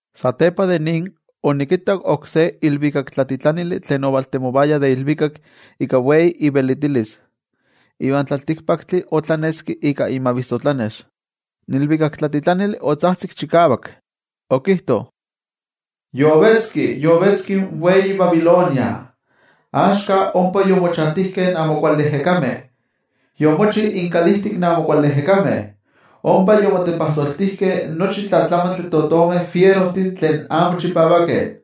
Satepa de nin, onikittak oksé ilvikaktlatitlanili tlen ovaltemovaya de ilvikak ika wei ivelitilis, iva in tlaltikpaktli otlaneski ika imavissotlanex. In ilvikaktlatitlanili otzajtzik chikavak, okijto: —Yovetzki, yovetzki in wei Babilonia, axka ompa yomochantijkeh in amo kuali ejekameh, yomochi inkalijtik in amo kuali ejekameh, ompa yomotepajsoltijkeh nochi tlamantli de totomeh fierojtih tlen amo chipavakeh.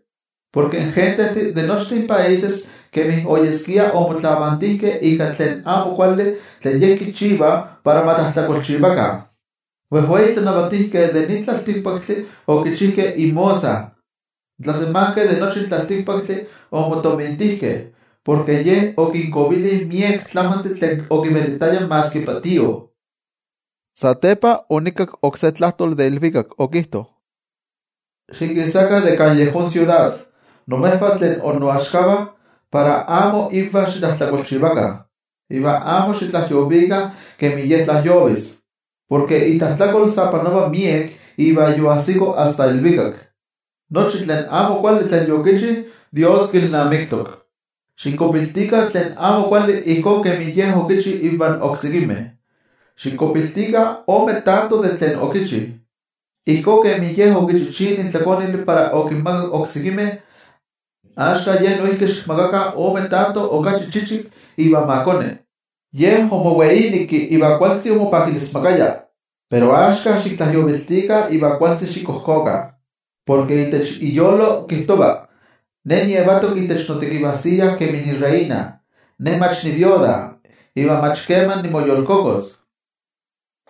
Porke in gentejtih de nochtin países kemi oyeskia omotlavantijkeh ika tlen amo kuali tlen ye kichiva para ma tlajtlakolchivakah. In wejwei tlanavatijkeh de nin tlaltikpaktli okichijkeh inmosa. In tlasemankeh de nochi in tlaltikpaktli omotomintijkeh, porke ye okinkovili miek tlamantli tlen okivelitaya maski patío. Satepa onikakki oksé tlajtoli de ilvikak, okijto: —Xikisakah de kan yejón siudad, imejvah tlen innoaxkavah, para amo ivan xitlajtlakolchivakah, iva amo xitlajyovikah kemi ye tlajyovis. Porke itlajtlakol sa panova miek iva yoajsito asta ilvikak. Nochi tlen amo kuali tlen yokichi, Dios kilnamiktok. Xikkuapiltikah tlen amo kuali ijkó kemi ye okichi ivan oksekimeh. Xikkuapiltikah ome tanto de tlen okichi. Ijkó kemi ye okichichili in tlakonili para okinmakak oksekimeh, axka ye noijki xikmakakah ome tanto okachi chichik iva ma koni. Ye omoweineki iva kualtzi omopakilismakaya, pero axka xiktlajyoviltikah iva kualtzi xikojkokah. Porke itech iyolo kijtova: “Ne nietok itech notekivajsiya kemi nireina. Ne mach niiknosivatl, iva mach keman nimoyolkokos.”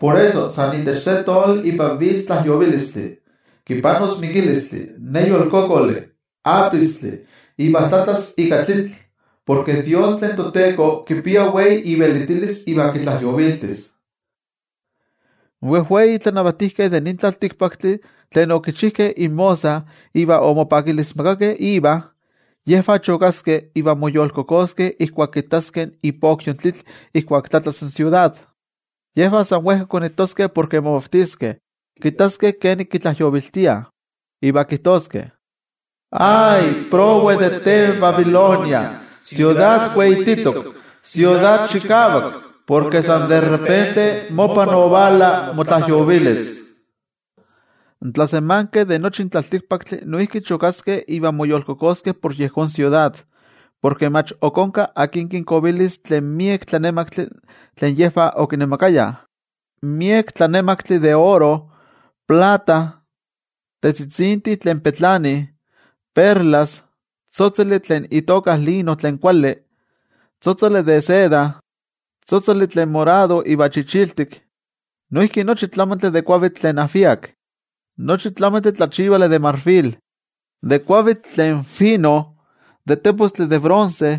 Por eso, san itech se tonali ipan vitz tlajyovilistli. Kipanos mikilistli, neyolkokoli, apistli, iva tlatlas ika tlitl. Porke Dios tlen toTeko kipia wei ivelitilis iva kitlajyoviltis. In wejwei tlanavatijkeh de nin tlaltikpaktli tlen okichijkeh inmosa iva omopakilismakakeh iva, yejvah chokaskeh iva moyolkokoskeh ijkuak kittaskeh ipokyo in tlitl ijkuak tlatlas in siudad. Yejvah san wejka konitoskeh porke momavtiskeh kittaskeh kenik kitlajyoviltiah, iva kijtoskeh: —¡Ay! Prowe de te, Babilonia, siudad weititok, siudad chikavak, porke san de repente mopa ovala motlajyovilis. In tlasemankeh de nochi in tlaltikpaktli noijki chokaskeh iva moyolkokoskeh por yejón siudad, porke mach ok onka akin kinkovilis tlen miek tlanemaktli tlen yejvah okinemakayah. Miek tlanemaktli de oro, plata, tetzitzintih tlen petlanih, perlas, tzotzoli tlen itoka lino tlen kuali, tzotzoli de seda, tzotzoli tlen morado iva chichiltik. Noijki nochi tlamantli de kuavitl tlen ajviak, nochi tlamantli tlachivali de marfil, de kuavitl tlen fino, de tepostli de bronce,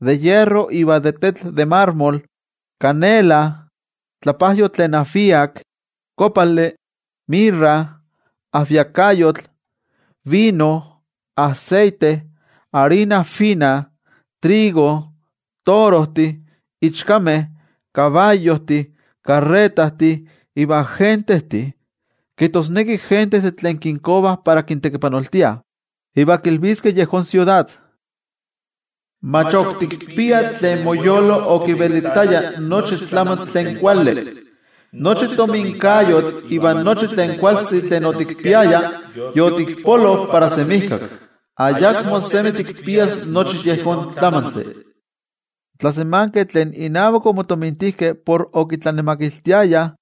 de hierro iva de tetl de marmol, canela, tlapajyotl tlen ajviak, kopali, mirra, ajviakayotl, vino, aseite, arina fina, trigo, torojtih, ichkameh, kabayojtih, karretajtih, iva gentejtih, kijtosneki gentejtih tlen kinkovah para kintekipanoltiah. Iva kilviskeh yejón siudad: —Mach ok tikpia tlen moyolo okivelitaya nochi tlamantli tlen kuali. Nochi tominkayotl ivan nochi tlen kualtzi tlen otikpiaya, yotikpolo para semijkak. Ayakmo semi tikpias nochi yejón tlamantli. In tlasemankeh tlen inavak omotomintijkeh por okitlanemakiltiayah,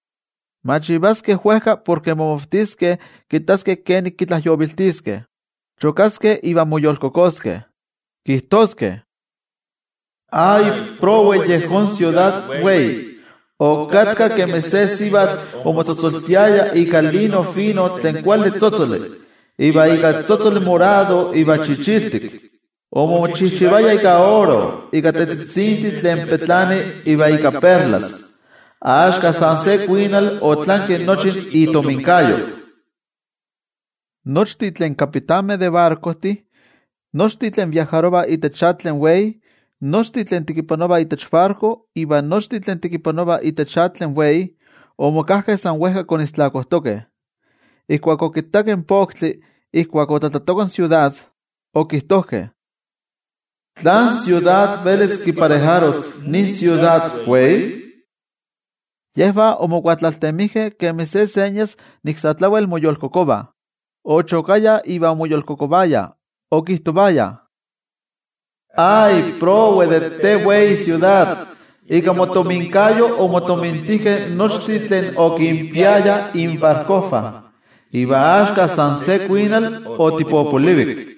machivaskeh wejka porke momavtiskeh kittaskeh kenik kitlajyoviltiskeh. Chokaskeh iva moyolkokoskeh. Kijtoskeh: —¡Ay! Prowe yejón siudad wei. Okatka kemi se sivatl omotzotzoltiaya ika lino fino tlen kuali tzotzoli iva ika tzotzoli morado iva chichiltik. Omochijchivaya ika oro, ika tetzitzintih tlen petlanih iva ika perlas. Axka san se kuinal otlanki nochi itominkayo. Nochtin tlen kapitanmeh de barkojtih, nochtin tlen viajarovah itech atl tlen wei, nochtin tlen tekipanovah itech barko, iva nochtin tlen tekipanovah itech atl tlen wei, omokajkeh san wejka konistlakojtokeh. Ijkuak okittakeh in poktli ijkuak otlatlatoka in siudad, okijtojkeh: —¿Tlán siudad velis kiparejaros nin siudad wei? Yejvah omokuatlaltemijkeh kemi se señas nik sa tlawel moyolkokovah. Ochokayah iva omoyolkokovayah, okijtovayah: —¡Ay! Prowe de te wei siudad. Ika motominkayo omotomintijkeh nochtin tlen okinpiayah inbarkojvah. Iva axka san se kuinal otipopolivik.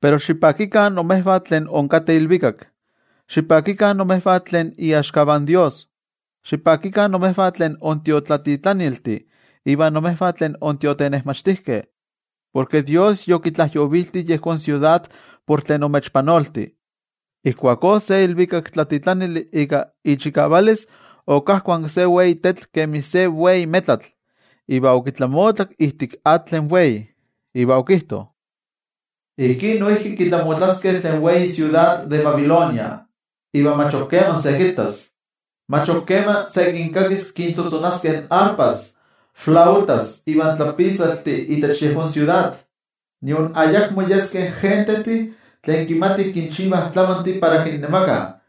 Pero xipakikah imejvah tlen inkateh ilvikak, xipakikah imejvah tlen iaxkavah in toYejwatzi, xipakikah imejvah tlen intiotlatitlaniltih iva imejvah tlen intiotenejmachtijkeh, porke toYejwatzi yokitlajyovilti yejón siudad por tlen omechpanolti. Ijkuakó se ilvikaktlatitlanili ika ichikavalis okajkuanki se wei tetl kemi se wei metlatl, iva okitlamotlak ijtik atl tlen wei. Iva okijto: —Ijkí noijki kitlamotlaskeh tlen wei siudad de Babilonia, iva mach ok keman se kittas. Mach ok keman se kinkakis kintzotzonaskeh arpajtih, flautajtih ivan tlapitzaltih itech yejón siudad. Nion ayakmo yeskeh gentejtih tlen kimatih kinchivah tlamantih para kinnemakah,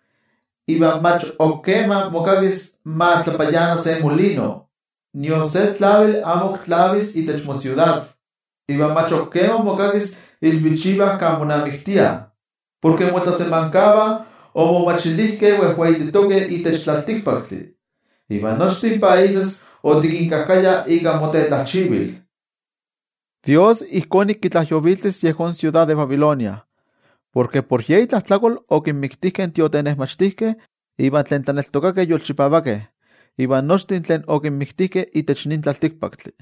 iva mach ok keman mokakis ma tlapayana se molino. Nion se tlavili amo ok tlavis itech mosiudad, iva mach ok keman mokakis ilvichivah kan monamiktiah. Porke motlasemankavah omomachilijkeh wejweititokeh itech tlaltikpaktli, iva nochtin países otikinkajkaya ika motetlajchivil. ToYejwatzi ijkó nik kitlajyoviltis yejón siudad de Babilonia, porke por ye itlajtlakol okinmiktijkeh in tiotenejmachtijkeh iva tlen tlaneltokakeh yolchipavakeh, iva nochtin tlen okinmiktijkeh itech nin tlaltikpaktli.